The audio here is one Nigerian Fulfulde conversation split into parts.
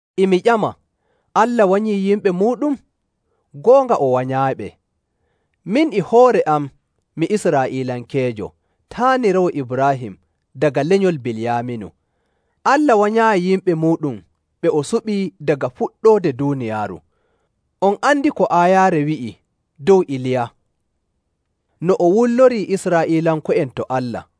E mi ƴama, Allah wanyii yimɓe muuɗum? Goonga, o wanyaayiɓe. Min e hoore am mi Israa'iilankeejo, taaniraawo Ibraahim daga lenyol Biliyaaminu.. Allah wanyaayi yimɓe muuɗum ɓe o suɓi daga fuɗɗoode duuniyaaru. On andi ko aayaare wi'i dow Iliya, no o wullorii Israa'iilanko'en to Allah.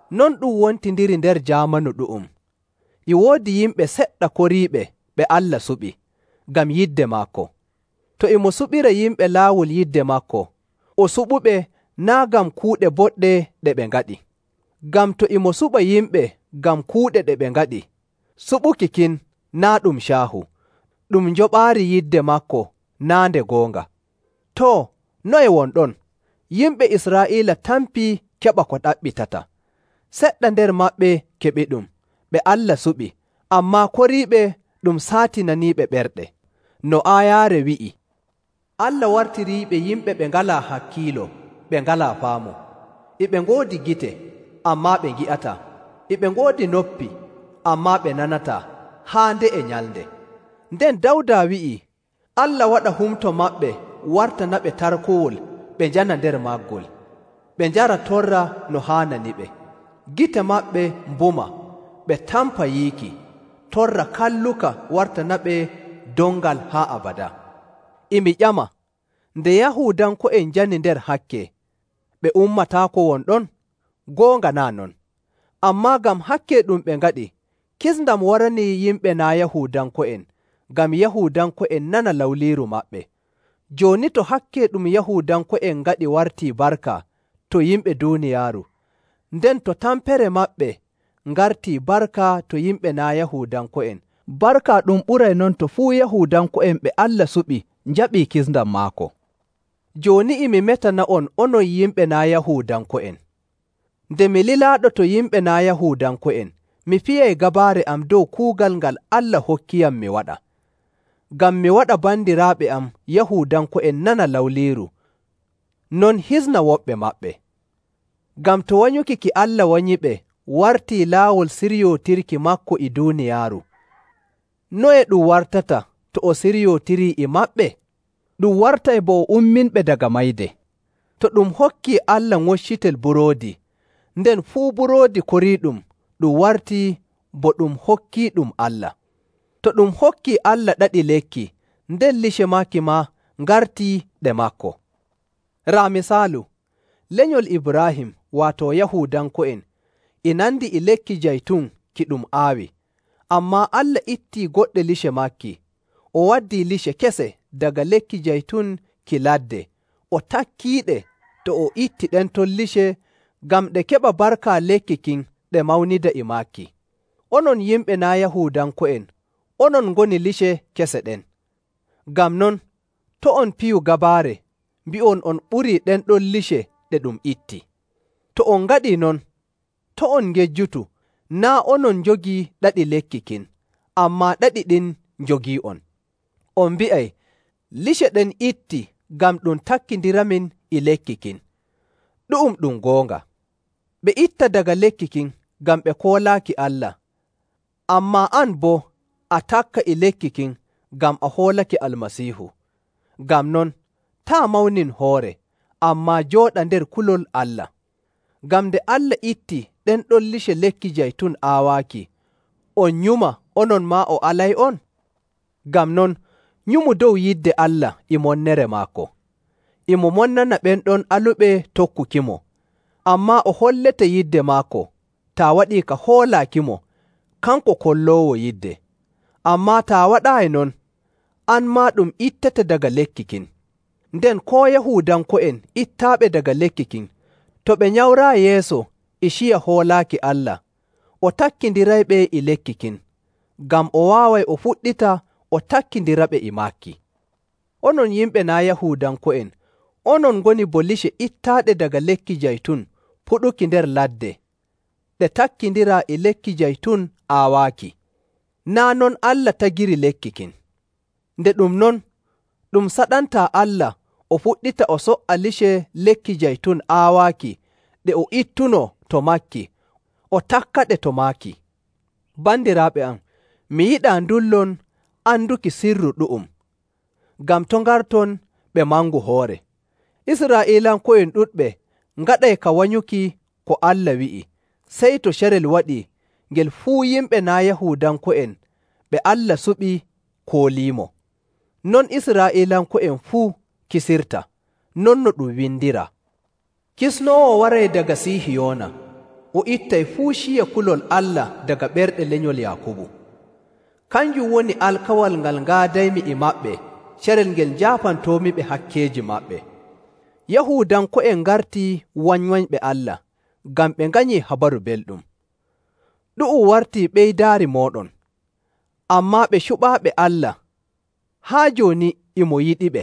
Non ɗum wontindiri nder jaamanu ɗu'um, e woodi yimɓe seɗɗa koriiɓe ɓe Allah suɓi, ngam yidde maako. To e mo suɓira yimɓe laawol yidde maako, o suɓuɓe naa' ngam kuuɗe boɗɗe ɗe ɓe ngaɗi. Ngam to e mo suɓa yimɓe ngam kuuɗe ɗe ɓe ngaɗi, suɓuki kin naa' ɗum caahu, ɗum njoɓaari yidde maako naa' nde goonga. Too, noye won ɗon? Yimɓe Israa'iila tampii keɓa ko ɗaɓɓitata. Seɗɗa nder maɓɓe keɓiɗum, ɓe Allah suɓi, ammaa koriiɓe ɗum saatinaniiɓe ɓerɗe. No aayaare wi'i, “Allah wartiriiɓe yimɓe ɓe ngalaa hakkiilo ɓe ngalaa faamu. E ɓe ngoodi gite, ammaa ɓe ngi'ataa, e ɓe ngoodi noppi, ammaa ɓe nanataa, haa nde'e nyalnde.”. Nden Dawda wi'ii, “Allah waɗa humto maɓɓe wartanaɓe tarkowol ɓe njana nder maggol, ɓe njara torra no haananiɓe; gite maɓɓe mbuma ɓe tampa yiiki, torra kalluka wartanaɓe dongal haa abadaa.”. E mi ƴama, nde Yahuudanko'en njani nder hakke, ɓe ummataako won ɗon? Goonga naa' non! Ammaa ngam hakke ɗum ɓe ngaɗi, kisndam waranii yimɓe naa' Yahuudanko'en ngam Yahuudanko'en nana lawliiru maɓɓe. Jooni to hakke ɗum Yahuudanko'en ngaɗi warti barka to yimɓe duuniyaaru, nden to tampere maɓɓe ngartii barka to yimɓe naa' Yahuudanko'en, barka ɗum ɓuray non to fuu Yahuudanko'en ɓe Allah suɓi njaɓii kisndam maako. Jooni e mi metana'on onon yimɓe naa' Yahuudanko'en. Nde mi lilaaɗo to yimɓe naa' Yahuudanko'en, mi fiyay gabaare am dow kuugal ngal Allah hokkiyam mi waɗa, ngam mi waɗa bandiraaɓe am Yahuudanko'en nana lawliiru, non hisna woɓɓe maɓɓe. Ngam to wanyuki ki Allah wanyiɓe wartii laawol siryootirki maako e duuniyaaru, noye ɗum wartata to o siryootirii e maɓɓe? Ɗum wartay bo o umminɓe daga mayde. To ɗum hokkii Allah ŋoccitel buroodi, nden fuu buroodi koriiɗum ɗum wartii bo ɗum hokkiiɗum Allah. To ɗum hokkii Allah ɗaɗi lekki, nden lice maaki maa ngartii ɗe maako. Raa misaalu. Lenyol Ibraahim, waato Yahuudanko'en e nandi e lekki jaytun ki ɗum aawi, ammaa Allah ittii goɗɗe lice maaki, o waddii lice kese daga lekki jaytun ki ladde o takkiɗe to o itti ɗen ton lice ngam ɗe keɓa barka lekki kin ɗe mawnida e maaki. Onon yimɓe naa' Yahuudanko'en, onon ngoni lice kese ɗen. Ngam non, to' on piyu gabaare mbi'on on ɓurii ɗen ton lice ɗe ɗum itti. To on ngaɗii non, to' on ngejjutu, naa' onon njogii ɗaɗi lekki kin, ammaa ɗaɗi ɗin njogii'on. On mbi'ay, “Lice ɗen itti ngam ɗum takkindiramin e lekki kin.” Ɗu'um ɗum goonga. Ɓe itta daga lekki kin ngam ɓe koolaaki Allah, ammaa an boo a takka e lekki kin ngam a hoolake Almasiihu. Ngam non, taa' mawnin hoore, ammaa jooɗa nder kulol Allah. Ngam nde Allah itti ɗen ɗon lice lekki jaytun aawaaki, on nyuma onon maa o alay'on? Ngam non, nyumu dow yidde Allah e monnere maako. E mo monnana ɓen ɗon aluɓe tokkukimo, ammaa o hollete yidde maako, taa waɗii ka hoolaakimo kanko kolloowo yidde. Ammaa taa waɗaayi non, an maa ɗum ittete daga lekki kin. Nden koo Yahuudanko'en ittaaɓe daga lekki kin, to ɓe nyamraayi yeeso e ciya hoolaaki Allah, o takkindirayɓe e lekki kin, ngam o waaway o fuɗɗita o takkindiraɓe e maaki. Onon yimɓe naa' Yahuudanko'en onon ngoni bo lice ittaaɗe daga lekki jaytun puɗuki nder ladde ɗe takkindiraa e lekki jaytun aawaaki. Naa' non Allah tagiri lekki kin. Nde ɗum non, ɗum saɗantaa Allah o fuɗɗita o so''a lice lekki jaytun aawaaki ɗe o ittunoo to maaki o takkaɗe to maaki. Bandiraaɓe am, mi yiɗaa ndullon anduki sirru ɗu'um, ngam to' ngarton ɓe mangu hoore. Israa'iilanko'en ɗuɗɓe ngaɗay ka wanyuki ko Allah wi'i sey to carel waɗii ngel fuu yimɓe naa' Yahuudanko'en ɓe Allah suɓi kooliimo. Non Israa'iilanko'en fuu kisirta. Non no ɗum windiraa, “Kisnoowo waray daga Sihiyoona, o ittay fuu ciya kulol Allah daga ɓerɗe lenyol Yaakubu.. Kanjum woni alkawal ngal ngaadaymi e maɓɓe carel ngel njaafantoomiɓe hakkeeji maɓɓe.”. Yahuudanko'en ngartii wanywanyɓe Allah ngam ɓe nganyii Habaru Belɗum. Ɗu'um wartii ɓeydaari mooɗon. Ammaa ɓe cuɓaaɓe Allah, haa jooni e mo yiɗiɓe,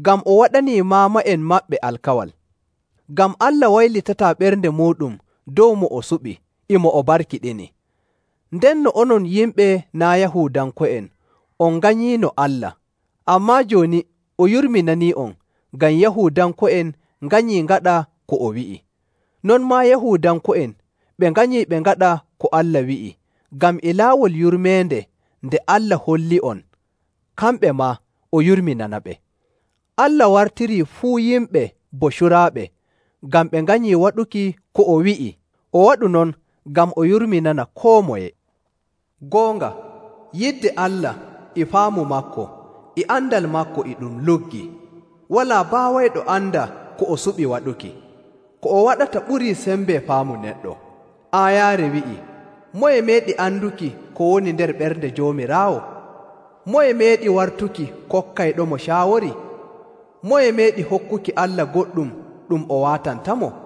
ngam o waɗanii maama'en maɓɓe alkawal. Ngam Allah waylitataa ɓernde muuɗum dow mo o suɓi e mo o barkiɗini. Ndenno onon yimɓe naa' Yahuudanko'en, on nganyiino Allah, ammaa jooni o yurminanii'on ngam Yahuudanko'en nganyii ngaɗa ko o wi'i. Non maa Yahuudanko'en ɓe nganyii ɓe ngaɗa ko Allah wi'i, ngam e laawol yurmeende nde Allah holli'on kamɓe maa o yurminanaɓe. Allah wartirii fuu yimɓe bo curaaɓe ngam ɓe nganyii waɗuki ko o wi'i, o waɗu non ngam o yurminana koo moye. Goonga, yidde Allah, e faamu maako, e andal maako e ɗum luggi. Walaa baawayɗo anda ko o suɓi waɗuki. Ko o waɗata ɓurii sembe faamu neɗɗo.. Aayaare wi'i, “Moye meeɗi anduki ko woni nder ɓernde Joomiraawo? Moye meeɗi wartuki kokkayɗomo caawori?. Moye meeɗi hokkuki Allah goɗɗum ɗum o waatantamo?”.